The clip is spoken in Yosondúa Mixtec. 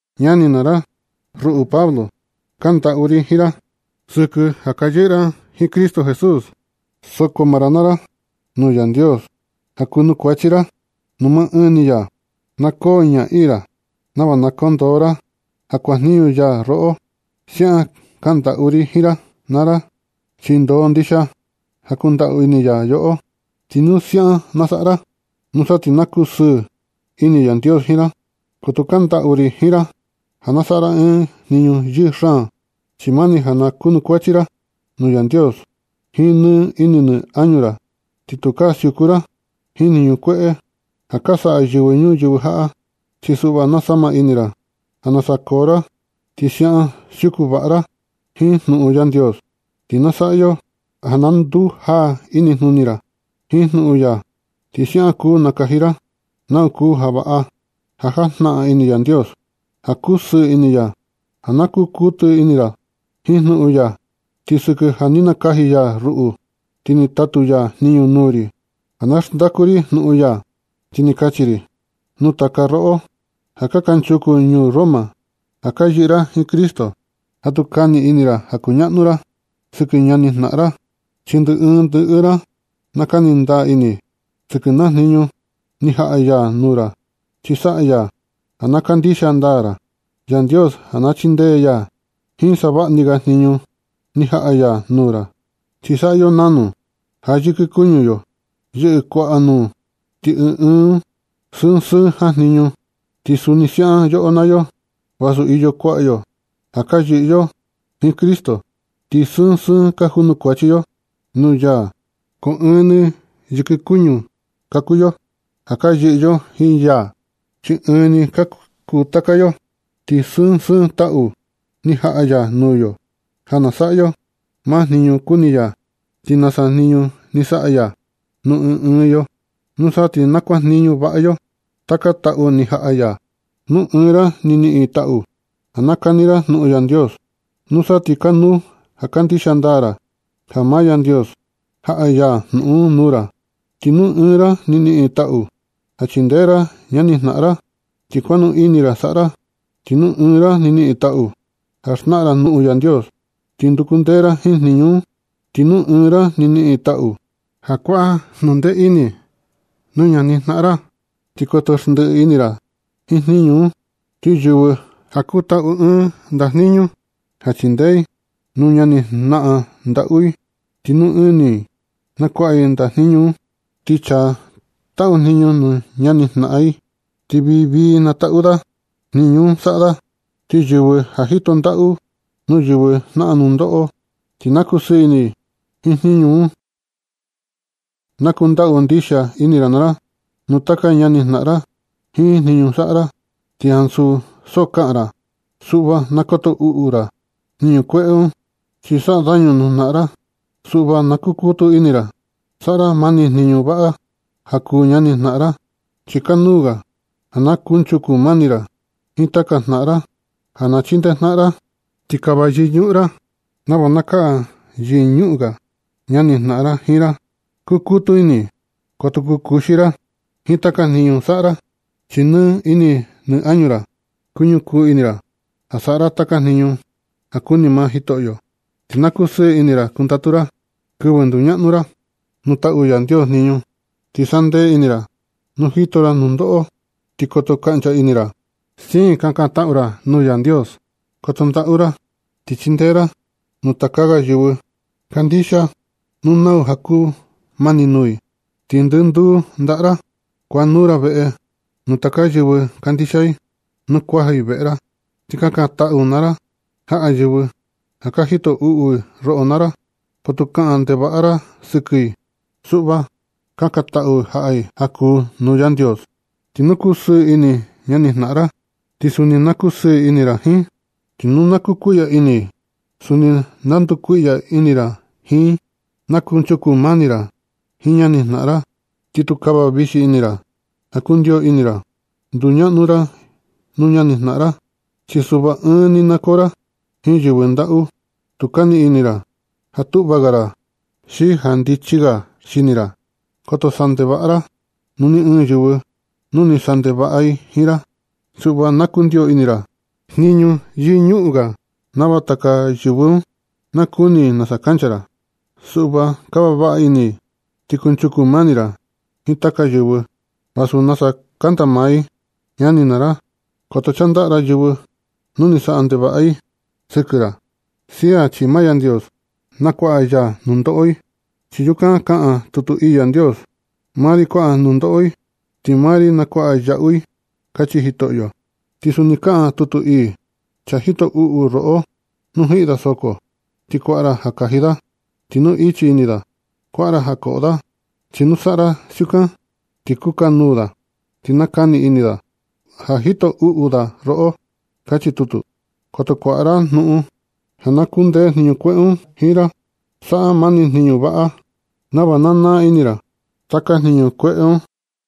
Ñani naa ra, ruꞌu Pablo, kandaꞌu ri jiin ra sɨkɨ ja ka yɨꞌɨ ra jiin Cristo Jesús. Soko maa ra naa ra nuu Yandios ja kuanukuachi ra nuu maa ɨɨn ni ya. Na koo ñaꞌii ra nava na kondoo ra ja kuajniñu ya roꞌo. Siaꞌan kaꞌan ndaꞌu ri jiin ra naa ra, chi ndoo ndixia ja kundaꞌu ini ya yoꞌo. Ti nu siaꞌan na saꞌa ra, nusa ti na kusɨɨ ini Yandios jiin ra. Ko tu kaꞌan ndaꞌu ri jiin ra ja na saꞌa ra ɨɨn jniñu yɨɨ xaan, chi mani ja na kunukuachi ra nuu Yandios jiin nɨ ini nɨ añu ra. Ti tukaa siuku ra jiin jniñu kueꞌe ja ka saꞌa yɨvɨ ñuyɨvɨ jaꞌa. Chi suꞌva na sama ra ini ra ja nasa koo ra, ti siaꞌan siuku vaꞌa ra jiin jnuꞌun Yandios, ti na saꞌa yo ja na ndujaa inijnuni ra jiin jnuꞌun ya. Ti siaꞌan kuu nakaji ra nau kuu ja vaꞌa ja jajnaꞌan ini Yandios, ja kusɨɨ ini ya, ja na ku kutu ini ra jiin jnuꞌun ya. Ti sɨkɨ ja ni nakaji ya ruꞌu, ti ni tatu ya jniñu nuu ri ja na xndaku ri jnuꞌun ya, ti na kachi ri nuu taka roꞌo ja kanchuku ini ñuu Roma ja ka yɨꞌɨ ra jiin Cristo, ja tu kani ini ra ja kuñaꞌnu ra sɨkɨ ñani jnaꞌan ra. Chi ndɨ ɨɨn ndɨ ɨɨn ra na kani ndaa ini sɨkɨ naa jniñu ni jaꞌa ya nuu ra. Chi saꞌa ya ja na kandixia ndaa ra Yandios ja na chindee ya jiin savaꞌa ni ga jniñu ni jaꞌa ya nuu ra. Chi saꞌa yo nanu ja yɨkɨ kuñu yo yɨꞌɨ kuaꞌa nuu, ti ɨɨn ɨɨn un sɨɨn sɨɨn jajniñu. Ti suni siaꞌan yoꞌo naa yo, vasu iyo kuaꞌa yo ja ka yɨꞌɨ yo jiin Cristo, ti sɨɨn sɨɨn ka junukuachi yo nuu ya ko ɨɨn ni yɨkɨ kuñu ka kuu yo ja ka yɨꞌɨ yo jiin ya, chi ɨɨn ni ka kuu taka yo. Ti sɨɨn sɨɨn taꞌu ni jaꞌa ya nuu yo ja na saꞌa yo maa jniñu kuni ya, ti nasa jniñu ni saꞌa ya nuu ɨɨn ɨɨn yo. Nusa ti na kuajniñu vaꞌa yo taka taꞌu ni jaꞌa ya. Nu ɨɨn ra ni niꞌin taꞌu ja nakani ra jnuꞌun Yandios, nusa ti kanuu ja kandixia ndaa ra ja maa Yandios jaꞌa ya jnuꞌun un nuu ra. Ti nu ɨɨn ra ni niꞌin taꞌu ja chindee ra ñani jnaꞌan ra, ti konuu ini ra saꞌa ra. Ti nu ɨɨn ra ni niꞌin taꞌu ja xnaꞌan ra jnuꞌun Yandios, ti nduku ndee ra jiin jniñu un. Ti nu ɨɨn ra ni niꞌin taꞌu ja kuaꞌa jnundee ini nuu ñanijnaꞌan ra, ti koto xndiꞌi ini ra jiin jniñu un. Ti yɨvɨ ja kutaꞌu ɨɨn ndajniñu ja chindee i nuu ñanijnaꞌan ndaꞌu i, ti nɨ ini i na kuaꞌa i ndajniñu un. Ti chaa taꞌu jniñu nuu ñani jnaꞌan, ti vii na taꞌu da jniñu un saꞌa da. Ti yɨvɨ ja jito ndaꞌu nuu yɨvɨ jnaꞌan nundoꞌo, ti na kusɨɨ ini i jiin jniñu un. Na kundaꞌu ndixia ini ra naa ra nuu taka ñanijnaꞌan ra jiin jniñu saꞌa ra, ti ansu ja so kaꞌan ra. Suꞌva na koto uꞌu ra jniñu kueꞌe un, chi saꞌa dañu nuu jnaꞌan ra. Suꞌva na kukutu ini ra saꞌa ra mani jniñu vaꞌa ja kuu ñani jnaꞌan ra. Chi kanuu ga ja na kunchuku mani ra jiin taka jnaꞌan ra, ja ka chindee jnaꞌan ra. Ti kava yɨñuꞌun ra nava na kaꞌan yɨñuꞌun ga ñanijnaꞌan ra jiin ra. Kukutu ini koto kukuxi ra jiin taka jniñu saꞌa ra, chi nɨ ini nɨ añu ra na kañukuu ini ra ja saꞌa ra taka jniñu ja kuni maa Jitoꞌyo. Ti na kosɨɨ ini ra kundatu ra kɨvɨ nduñaꞌnu ra nuu taꞌu Yandios jniñu. Ti na sandee ini ra nu jito ra nundoꞌo. Ti koto kaꞌncha ini ra, siin ka kantaꞌu ra nuu Yandios. Koto ndaꞌu ra ti chindee ra nuu taka ga yɨvɨ kandixia nu nau ja kumani nuu i. Ti ndɨnduu ndaꞌa ra kuanuu ra veꞌe nuu taka yɨvɨ kandixia i nu kuaja i veꞌe ra. Ti kakantaꞌu naa ra jaꞌa yɨvɨ ja ka jito uꞌu i roꞌo naa ra. Ko tu kaꞌan ndevaꞌa ra sɨkɨ i. Suꞌva, kakantaꞌu jaꞌa i ja kuu nuu Yandios. Ti nu kusɨɨ ini ñanijnaꞌan ra, ti suni na kusɨɨ ini ra jiin i. Ti nu kukuiꞌya ini i, suni na ndukuiꞌya ini ra jiin i. Na kunchuku mani ra jiin ñanijnaꞌan ra, ti tu kava vixi ra ja kundio ini ra nduñaꞌnu ra nuu ñanijnaꞌan ra. Chi suꞌva ɨɨn ni na koo ra jiin yɨvɨ ndaꞌu. Tu kani ini ra ja tuꞌva ga ra xi ja ndichi ga xini ra. Koto saꞌa ndevaꞌa ra nuu ni ɨɨn yɨvɨ, nu ni saꞌa ndevaꞌa i jiin ra. Suꞌva na kundio ini ra jniñu yɨñuꞌun ga nava taka yɨvɨ un nakuni i nasa kancha ra. Suꞌva kava vaꞌa ini ra ti kunchuku mani ra jiin taka yɨvɨ, vasu nasa kanda maa i. Ñani naa ra, koto chandaꞌa ra yɨvɨ nu ni saꞌa ndevaꞌa i sɨkɨ ra. Sia chi maa Yandios na kuaꞌa ya nundoꞌo i. Chi yukan kaꞌan tutu ii Yandios: “Maa ri kuaꞌa nundoꞌo i, ti maa ri nakuaꞌa yaꞌu i”, kachi Jitoꞌyo. Ti suni kaꞌan tutu ii: “Chaa jito uꞌu roꞌo, nu jiꞌi da soko, ti kuaꞌa ra ja kaji da. Ti nu ichi ini da, kuaꞌa ra ja koꞌo da. Chi nu saꞌa ra siukan, ti kukanuu da ti nakani ini da ja ni jito uꞌu da roꞌo”, kachi tutu. Koto kuaꞌa ra jnuꞌun ja na kundee jniñu kueꞌe un jiin ra. Saꞌa mani jniñu vaꞌa nava na naa ini ra taka jniñu kueꞌe un.